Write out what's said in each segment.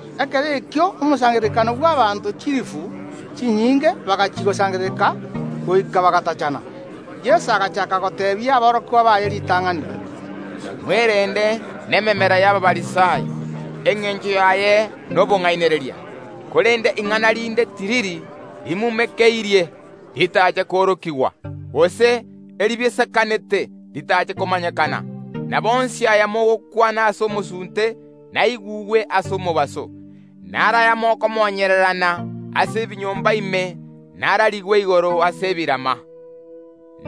Ekero ekio omosangererekano bw’abaanto chilifu chinyinge bagachia gosangerereka goika bagatachana. Yeso agachaaka goteebia aborokigwa baye ritang’ani, Mwerende nememera y’Abafarisai, engencho yaye nobong’ainereria. Korende ing’ana rinde tiriri rimumekeirie, ritache koorokigwa, gose eribisekanete ritache komanyekana. Nabo onsi aya mogokwana ase omosunte, naigugwe ase omobaso; naro aya mokomonyererana ase ebinyomba ime nararigwe igoro ase ebirama.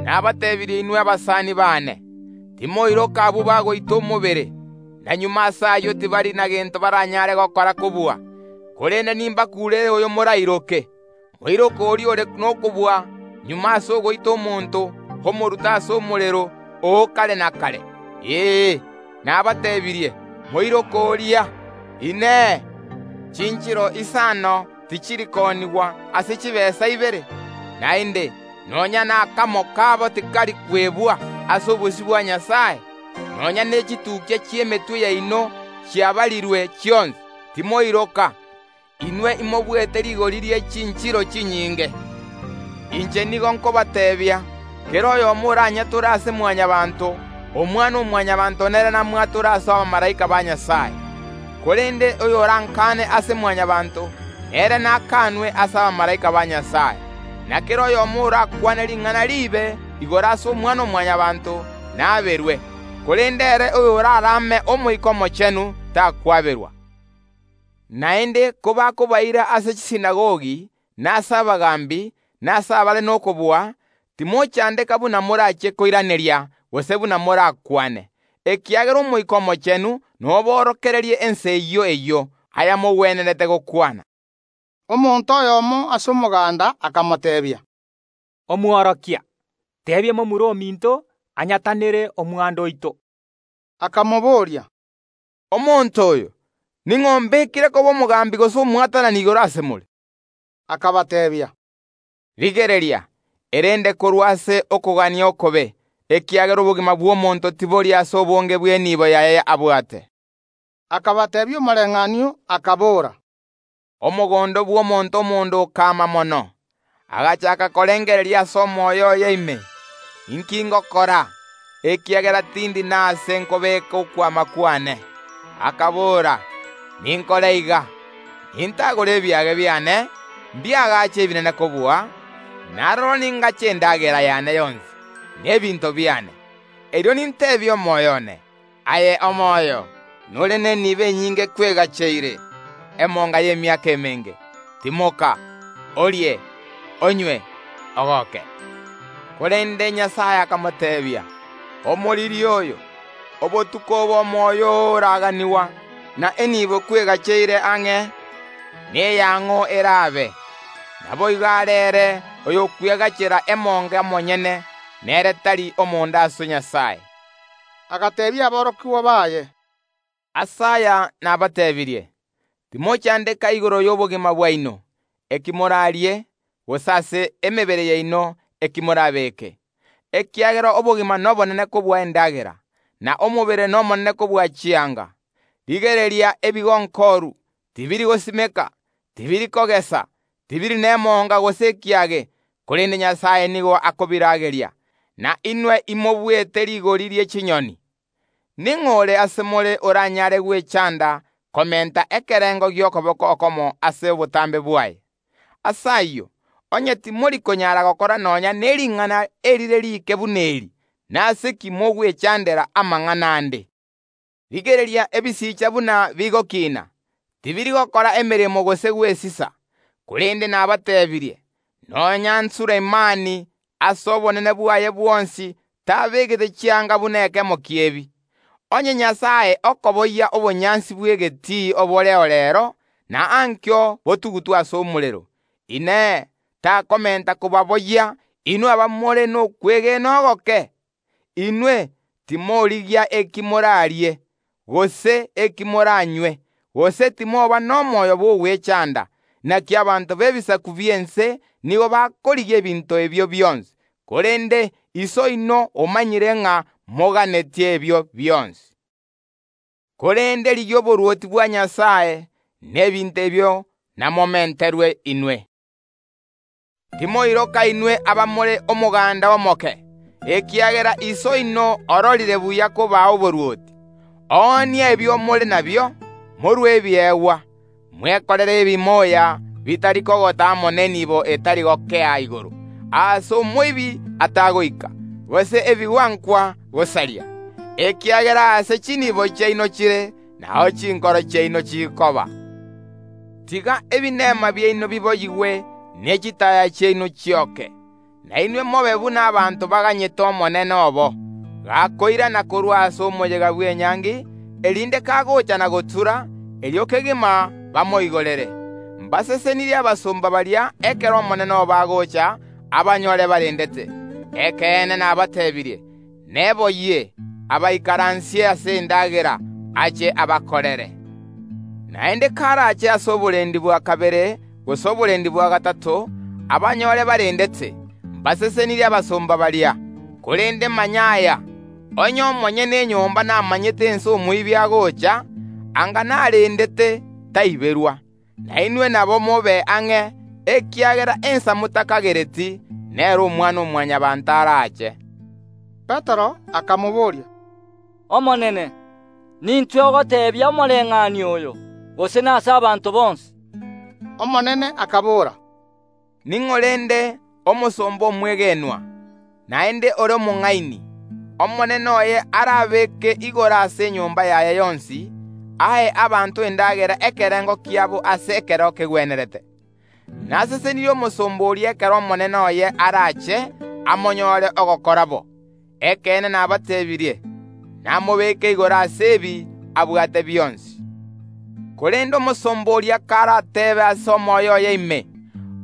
Nabatebirie inwe abasani baane, timoiroka abwo bagoita omobere, na magega ase ayio tibari negento baranyare gokora kobua. Korende nimbakuurere oyo morairoke: Moiroke oria ore nokobua, magega ase ogoita omonto omoruta ase omorero o kare na kare. Ee, nabateebirie, moiroke oria! Inee! Chinchiro isano tichiri koonigwa ase chitaabu ibere? Naende nonya nakamo kabo tikari kwebwa ase obosio bwa Nyasae. Nonya nechitukia chi’emetwe yaino chiabarirwe chionsi. Timoiroka; inwe imobuete rigori rie chinchiro chinyinge. Inche nigo nkobateebia, kera oyomo oranyatore ase Mwanyabaanto, Omwana‐o‐Mwanyabaanto nere namwatore ase abamalaika ba Nyasae; korende oyorankaane ase Mwanyabaanto, nere nakaanwe ase abamalaika ba Nyasae. Na kera oyomo orakwane ring’ana riibe igoro ase Omwana‐o‐Mwanyabaanto, naaberwe; korende ere oyorarame Omoika Omochenu takwaberwa. Naende kobakobaira ase chisinagogi, na ase abagaambi, na ase abare nokobua, timochandeka buna morachie koiraneria gose buna morakwane, ekiagera Omoika Omochenu noborokererie ensa eyio eyio ayamogwenerete gokwana. Omonto oyomo ase omoganda akamoteebia, “Omworokia, teebia momura ominto anyatanere omwando oito.” Akamoboria, “Omonto oyo, ning’o ombekire koba omogambi gose omwatanani igoro ase more?” Akabateebia, “Rigereria, erende korwa ase okogania okobe, ekiagera obogima bw’omonto tibori ase obonge bw’enibo yaye abwate.” Akabateebia omoreng’anio, akabora, “Omogondo bw’omonto omonda okama mono. Agachaaka korengereria ase omoyo oye ime: Inki ngokora, ekiagera tindi nase nkobeeka okwama kwane? Akabora: Ninkore iga: Nintagore ebiage biane, mbiagache ebinene kobua, na aroro ningache endagera yane yonsi, na ebinto biane. Erio ninteebie omoyo one: Aye omoyo, nore nenibo enyinge kwegacheire emonga y’emiaka emenge; timoka, orie, onywe, ogoke. Korende Nyasae akamoteebia: Omoriri oyo, obotuko obo omoyo oo oraganigwa, na enibo kwegacheire ang’e, neya ng’o erabe? Naboigo are ere oyokwegachera emonga omonyene, na ere tari omonda ase Nyasae.” Agateebia aborokigwa baye, “Ase aya nabateebirie, timochandeka igoro y’obogima bwaino, eki morarie; gose ase emebere yaino, eki morabeeke. Ekiagera obogima nobonene kobua endagera, na omobere nomonene kobua chianga. Rigereria ebigonkoru, tibiri gosimeka, tibiri kogesa, tibiri nemonga gose ekiage, korende Nyasae nigo akobirageria. Na inwe imobuete rigori rie chinyoni! Ning’o ore ase more oranyare gwechanda komenta ekerengo gi’okoboko okomo ase obotambe bwaye? Ase ayio, onye timori konyara gokora nonya ne ring’ana erire riike buna eri, nase ki mogwechandera amang’ana ande? Rigereria ebisicha buna bigokina; tibiri gokora emeremo gose gwesisa, korende nabateebirie, nonya n’Sulemani ase obonene bwaye bwonsi tabegete chianga buna ekemo ki’ebi. Onye Nyasae okoboyia obonyansi bw’egetii oboreo reero, na ankio botugutwe ase omorero, Inee, takomenta kobaboyia inwe abamore nokwegena ogoke? Inwe, timorigia eki morarie, gose eki moranywe; gose timoba nomoyo bw’ogwechanda. Naki abanto b’ebisaku bi’ense nigo bakorigia ebinto ebio bionsi, korende Iso oino omanyire ng’a moganetie ebio bionsi, Korende rigia oborwoti bwa Nyasae, na ebinto ebio namomenterwe inwe. “Timoiroka inwe abamore omoganda omoke, ekiagera Iso oino ororire buya kobaa oborwoti. Oonia ebio more nabio, morue ebiegwa; mwekorere ebimoya bitari kogota amo nenibo etari gokea igoro, aase omoibi atagoika, gose ebigwankwa gosaria. Ekiagera aase chinibo chiaino chire nao chinkoro chiaino chikoba. “Tiga ebinema biaino biboyigwe, ne chitaaya chiaino chioke; na inwe mobe buna abanto baganyete omonene obo, gakoirana korwa ase omoyega bw’enyangi, erinde kagocha na gotura, erio kegima bamoigorere. Mbasesenirie abasomba baria ekero omonene obo agocha abanyore barendete. Ekeene nabateebirie: Neboyie, abaikaransie ase endagera, ache abakorere. Naende karache ase oborendi bwa kabere gose oborendi bwa gatato, abanyore barendete, mbare nomogooko abasomba baria. Korende manya aya, onye omonyene enyomba namanyete ensa omoibi agocha, anga narendete, taiberwa. Nainwe nabo, mobe ang’e, ekiagera ensa motakagereti, nero Omwana‐o‐Mwanyabaanto arache.” Petero akamobooria, “Omonene, nintwe ogoteebia omoreng’anio oyo, gose nase abanto bonsi?” Omonene akabora, “Ning’o rende ore omosomba omwegenwa, naende ore omong’aini, omonene oye arabeeke igoro ase enyomba yaye yonsi, ae abanto endagera ekerengo kiabo ase ekero kegwenerete? Nasesenirie omosomba oria ekero omonene oye arache amonyore ogokora bo. Ekeene nabateebirie, namobeke igoro ase ebi abwate bionsi. Korende omosomba oria karateebe ase omoyo oye ime: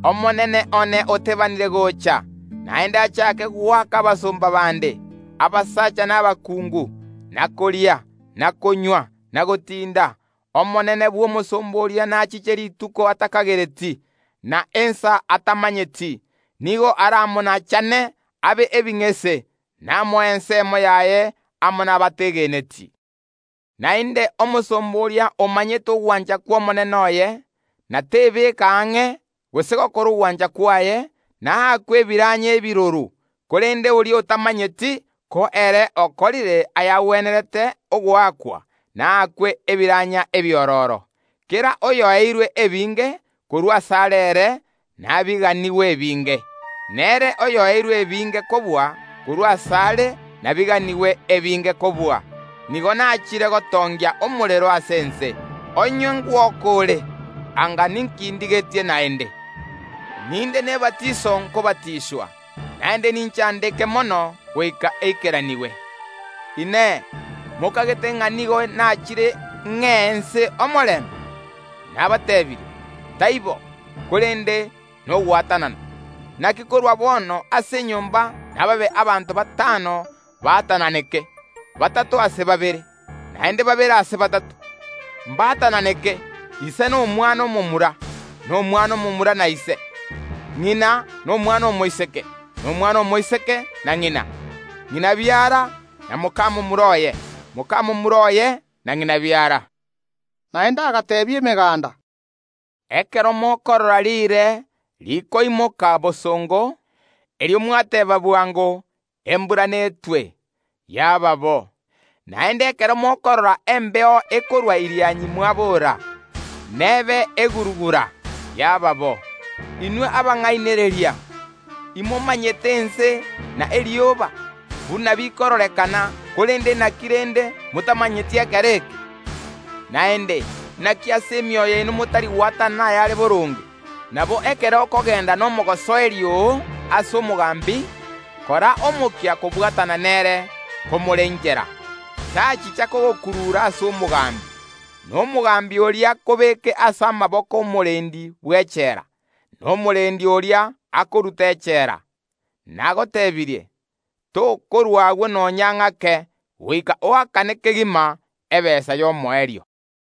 Omonene one otebanire gocha, naende achake goaka abasomba bande, abasacha na abakungu, na koria, na konywa, na gotinda, omonene bw’omosomba oria nachiche rituko atakagereti, na ensa atamanyeti, nigo aramonachane abe ebing’ese, namoe ensemo yaye amo nabategeneti. Naende omosomba oria omanyete ogwancha kw’omonene oye, na tebeka ang’e, gose gokora ogwancha kwaye, naakwe ebiranya ebiroro, korende oria otamanyeti, ko ere okorire ayagwenerete ogoakwa, naakwe ebiranya ebiororo. Kera oyoeirwe ebinge, korwa asare ere nabiganigwe ebinge; na ere oyoeirwe ebinge kobua, korwa asare nabiganigwe ebinge kobua. “Nigo nachire gotongia omorero ase ense; onye ngwoka ore, anga ninki ndigetie naende? Ninde nebatiso nkobatiswa, naende ninchandeke mono goika eikeranigwe! Inee! Mokagete ng’a nigo nachire ng’ee ense omorembe? Nabatebirie, taibo, korende nogwatanana. Naki korwa bono ase enyomba nababe abanto batano baatananeke, batato ase babere, naende babere ase batato. Mbaatananeke, ise na omwana omomura, na omwana omomura na ise, ng’ina na omwana omoiseke, na omwana omoiseke na ng’ina; ng’ina biara, na moka momura oye, moka momura oye na ng’ina biara.” Naende agateebia emeganda, “Ekero mokorora riire rikoimoka bosongo, erio mwateeba bwango: Embura netwe; yaba bo. Naende ekero mokorora embeo ekorwa Irianyi mwabora. Nebe eguru‐gura; yaba bo. Inwe abang’ainereria! Imomanyete ense na igoro, buna bikororekana, korende naki rende, motamanyeti ekero eke? “Naende naki ase emioyo yaino motari gwatanana ayare boronge? Nabo ekero okogenda nomogosoeri oo ase omogambi, kora omokia kobwatana nere komore ’nchera, tachicha kogokurura ase omogambi, na omogambi oria akobeke ase amaboko ’omorendi bw’echela, na omorendi oria akorute echela. Nagotebirie, tokorwa agwo nonya ng’ake goika oakane kegima ebesa y’omoerio.”